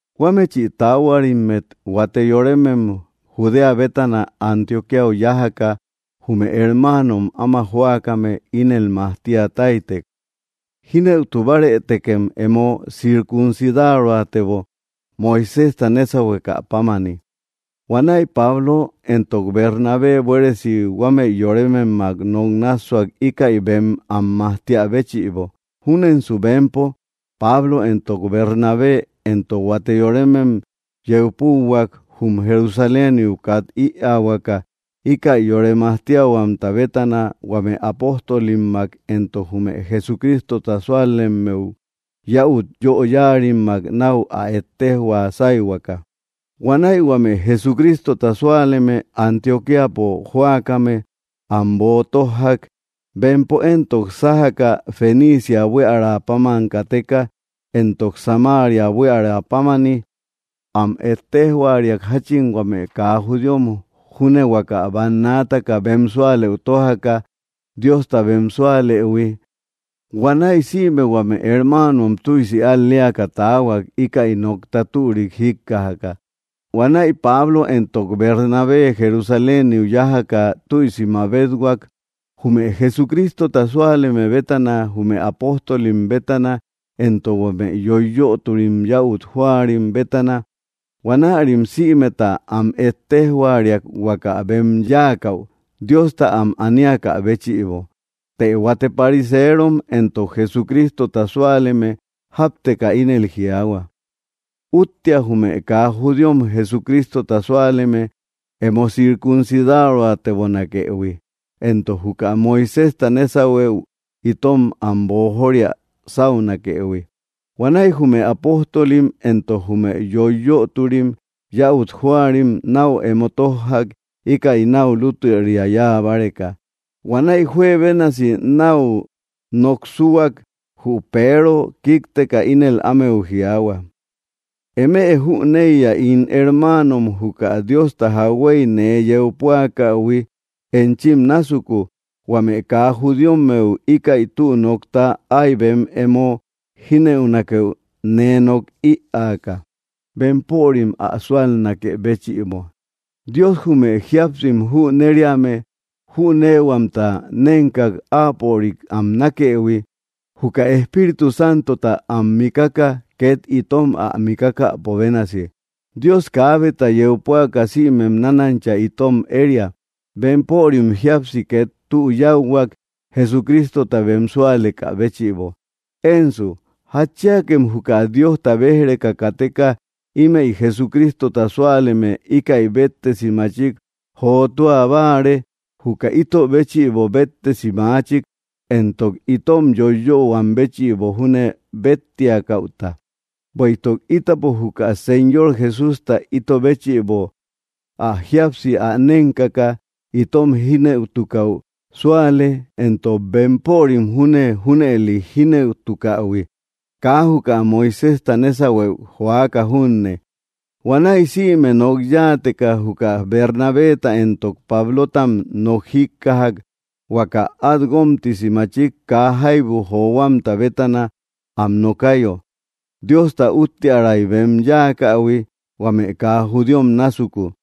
Huámechi taáhuarimmet huate yorémem Judéa bétana Antioquíau yájaka jume hermáanom áma jóakame ínel majtia táytek: “Jínëutu bárëtekem emo circuncidaroatebo, Moiséjta nésauhuekä pámani.” Huanäi Pablo éntok Bernabé buéresi huámëi yorémemmak nok nássuak íkäi bem am majtíä béchïbo. Júnensu bempo, Pablo éntok Bernabé, éntok huate yorémem, yeu púahuak jum Jerusaléniu kat ïaahuaka íkäi yore majtíahuamta bétana huame apóstolimmak éntok jume Jesucrístota súalemmeu yäut yóyarimmak nau áa ettéjhua sáihuaka. Huanäi huame Jesucrístota súaleme Antioquíapo jóakame am boo tójjak. Bempo éntok, sájaka Fenicia buiära páman kateka, éntok Samaria buíara pámani, am ettéjhuariak jachin huame kaa judíom júne huaka bannaataka bem súalëu tójaka Diosta bem súalëhui. Huanäi sïme huame hermáanom tüisi al‑léaka taahuak íkäi nokta türik jíkkajaka. Huanäi Pablo éntok Bernabé Jerusaléniu yájaka tüisi mabéthuak jume Jesucrístota súaleme bétana jume apóstolim bétana éntok huame yoiyöturi yäut jóarim bétana. Huanärim sïmeta am ettéjhuariak huaka bem yáakäu Diosta am aníakä béchïbo. Të huate pariseerom éntok, Jesucrísota súaleme, jápteka ínel jiaahua: —Úttea jume kaa judíom Jesucristota súaleme emo circuncidaroatebonakëhui, éntok juka Moiséjta nésauhuëu itom am boojoria sáunakëhui. Huanäi jume apóstolim éntok jume yoiyötori yäut jóarim nau emo tójjak íkäi nau lútüria yáa báreka. Huanäi juebénasi nau noksúak, jü Peero kíkteka ínel ámeu jiaahua: —Eme jüneiya, ín hermáanom, juka Diosta jakhuéy nee yeu púakähui enchim násuku, huame kaa judíommeu íkäi tü nokta ái bem emo jínëunakeu nee nok ïaaka, bempörim ä súalnakë béchïbo. Dios jume jíapsim jünériame jünéehuamta nénkak áapörik am nákëhui, juka Espíritu Santota am mikaka ket itom ä mikákäpo bénasi. Dios kaábeta yeu púaka sïmem nánancha itom eria. Bempörim jíapsi ket tü yáuhuak Jesucrístota bem súalekä béchïbo. Ensu, ¿jatchíakem juka Diosta béj‑reka kateka imey Jesucrístota súaleme íkäi béttesi machik jotúa báare, juka ito béchïbo béttesi maáchik, éntok itom yoiyöhuam béchïbo júne bettiakäuta? Bueïtuk ítapo juka Señor Jesústa ito béchïbo áa jíapsi ä nénkaka itom jínëutukäu súale, éntok bempörim júne junëli jínëutukähui, kaa juka Moiséjta nésauhuëu joaka junne. Huanäi sïme nok yáateka juka Bernabeta éntok Pablótam nok jíkkajak huaka at guómtisi machik kaa jaibu johuamta bétana am nokayo, Diosta úttiäray bem yáakähui huame kaa judíom násuku.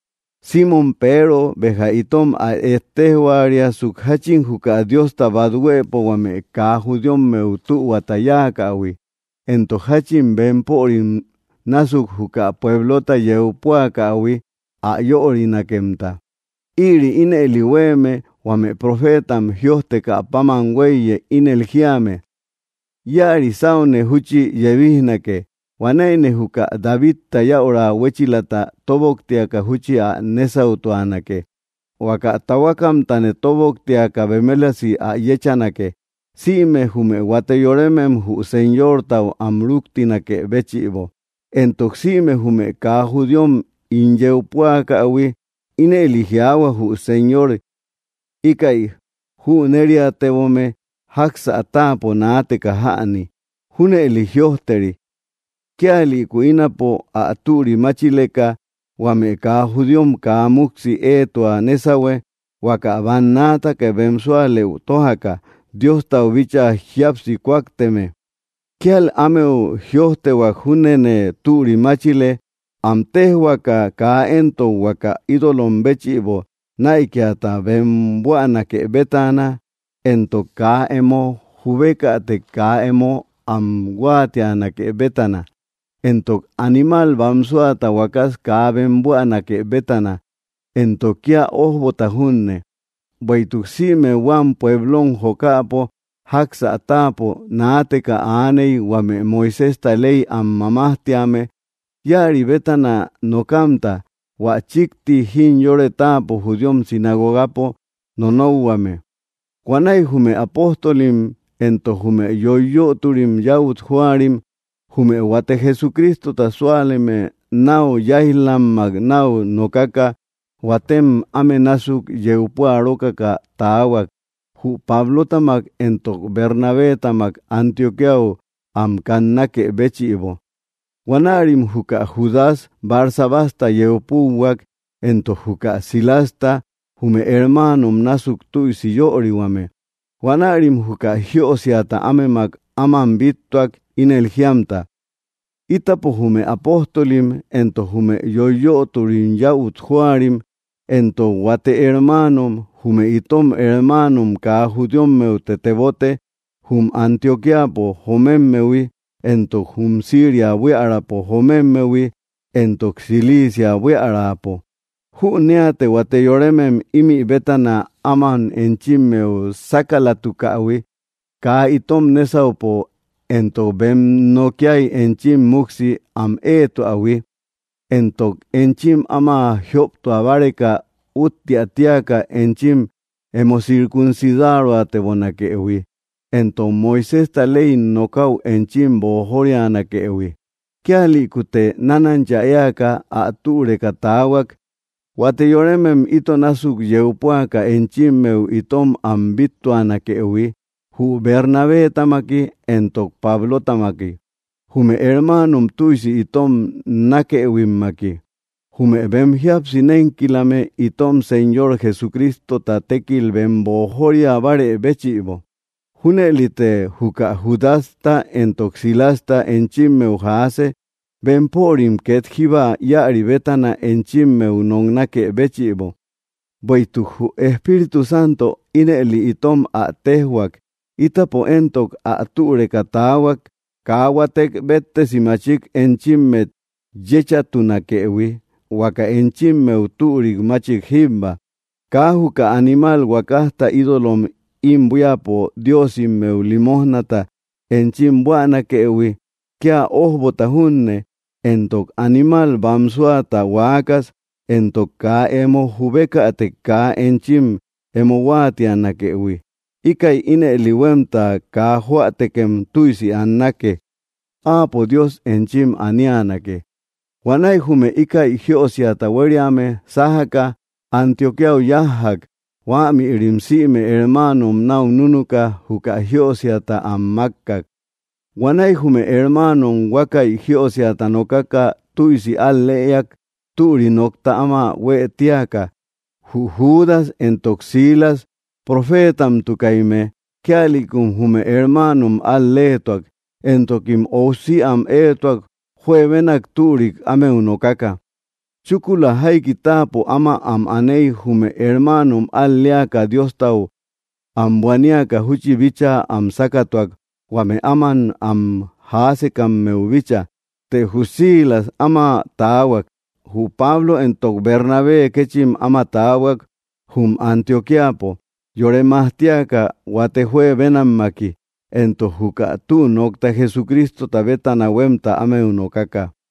Simmom Peero béja itom ä ettéjhuariasuk jachin juka Diosta bat huëpo huame kaa judíommeu tühuata yáakähui, éntok jachin bempörim násuk juka puéblota yéä püakähui ä yörinakemta. Ïri ínëli huéeme huame profeetam jïojtekä páman huéiye, ínel jíame: Íäri sáune júchi yebijnake; huanäine juka Davidta yäura huéchilata tóboktiaka júchi ä nésautuanake. Huaka tahuakamtane tóboktiaka bemelasi ä yéchanake, simë jume huate yoremem jü Señortau am rúktinakë béchïbo, éntok sïme jume kaa judíom ín yeu püakähui. Ínëli jiaahua jü Señor: “Íkäi jünériatebome, jáksä táapo naateka jäni.” ’Júnëli jïojteri: Kíalïku ínapo ä türi máchileka, huame kaa judíom kaa muksi éetua nésahue, huaka bannaataka bem súalëu tójaka, Diostau bíchaa jíapsi kúakteme. Kíal ámeu jïojtehuak, júnene türi máchile, am téjhuaaka kaa éntok huaka ídolom béchïbo näikiata bem buänake bétana, éntok kaa emo jubekätek kaa emo am huáatianake bétana, éntok animal bámsuata huakas kaa bem buänake bétana, éntok kia ójbota junne. Bueïtuk sïme huam pueblom jokäpo, jáksä táapo naateka aaney, huame Moiséjta ley am mamajtíame, íäri bétana nokamta, hua chíkti jimyore táapo judíom sinagogapo nonokhuame. Huanäi jume apóstolim éntok jume yoiyötori yäut jóarim, jume huate Jesucrístota súaleme nau yáij‑lammak nau nokaka, huátem áme násuk yeu puarókaka taahuak, jü Pablótamak éntok Bernabétamak Antioquíau am kannákë béchïbo. Huanärim juka Judas Barsabasta yeu púuhuak, éntok juka Silasta, jume hermáanom násuk tüisi yörihuame. Huanärim juka jiösiata ámemak áman bíttuak ínel jíamta: “Ítapo jume apóstolim, éntok jume yoiyöturi yäut jóarim, éntok huate hermáanom, jume itom hermáanom kaa judíommeute tebote, jum Antioquíapo jomémmehui éntok jum Siria buíaräpo jomémmehui éntok Cilicia buíaräpo. Jünéate huate yorémem ímï bétana áman enchimmeu sákalatukähui kaa itom nésaupo éntok bem nokíai enchim muksi am éetuähui, éntok echim áma jióptua báreka úttiä tíaka enchim emo circuncidaroatebonakëhui, éntok Moiséjta ley nokäu enchim boojorianakëhui. Kíalïkute nánancha éaka ä türeka taahuak huate yorémem ito násuk yeu púaka enchimmeu itom am bíttuanakëhui, jü Bernabétamaki éntok Pablótamiki, jume hermáanom tüisi itom nákëhuimmaki, jume bem jíapsi nénkilame itom Señor Jesucrístota tékil bem boojóriabarë béchïbo. Júnëlite juka Judasta éntok Silasta enchimmeu jaase bempörim ket jíba íäri bétana enchimmeu noknákë béchïbo. Bueïtuk jü Espíritu Santo ínëli itom ä téjhuak, ítapo éntok, ä türeka taahuak, kaa huátek béttesi machik enchímmet yéchatunakëhui huaka enchimmeu türik machik jíbba: kaa juka animal huakajta ídolom im buíapo diósimeu limójnata enchim buänakëhui, kia ójbota junne, éntok animal bámsuata huaakas; éntok kaa emo jubékätek kaa enchim emo huáatianakëhui. Íkäi ínëli huemta kaa jóätekem tüisi annake. Áapo, Dios, enchim aníanake.” Huanäi jume íkäi jiösiata huériame sájaka Antioquíau yájjak. Huämïrim sïme hermáanom nau núnuka juka jiösiata am mákkak. Huanäi jume hermáanom huákäi jiösiata nokaka tüisi al‑lëak türik nokta áma huë tíaka. Jü Judas éntok Silas profétamtukaimme, kíalïkum jume hermáanom al‑léetuak, éntokim óusi am éetuak juebénak türik ámeu nokaka. Chúkula jaiki táapo áma am anéi, jume hermáanom al‑léaka Diostau am buaníaka júchi bíchaa am sákatuak huame áman am jaásekammeu bícha. Të jü Silas áma taahuak. Jü Pablo éntok Bernabé kéchim áma taahuak jum Antioquíapo, yore majtíaka huate juebénammaki, éntok juka tü nokta Jesucrístota bétana huemta ámeu nokaka.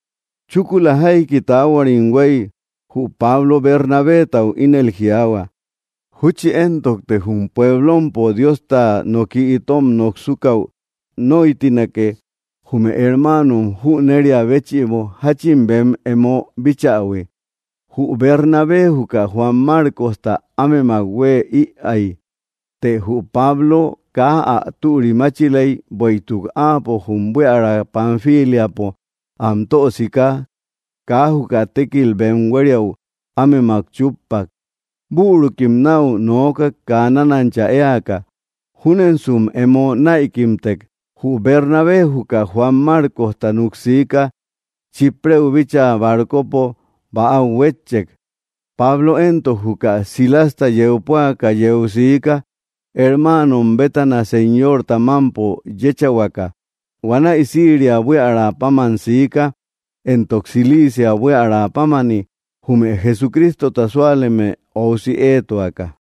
Chúkula jaiki taáhuarim huéi, jü Pablo Bernabetau ínel jiaahua: —Júchi éntokte jum puéblompo Diosta noki itom noksúkäu nóitinake jume hermáanom jüneria béchïbo jachin bem emo bíchähui. Jü Bernabé juka Juan Márcosta ámemak hueë ïai, të jü Pablo kaa ä türimáchilei, bueïtuk áapo jum buiära Panfíliapo am tösiká kaa juka tékilta bem huériäu ámemak chúppak. Bürukim nau noókak kaa nánancha éaka, júnensum emo näikimtek. Jü Bernabé juka Juan Márcosta nuksiká Chíprë bíchaa barcopo bäau huétchek. Pablo éntok, juka Silasta yeu púaka, yeu siika hermáanom bétana Señorta mampo yéchahuaka. Huanäi Siria buiära páman siika éntok Cilicia buíarapámani, jume Jesucrístota súaleme óusi éetuaka.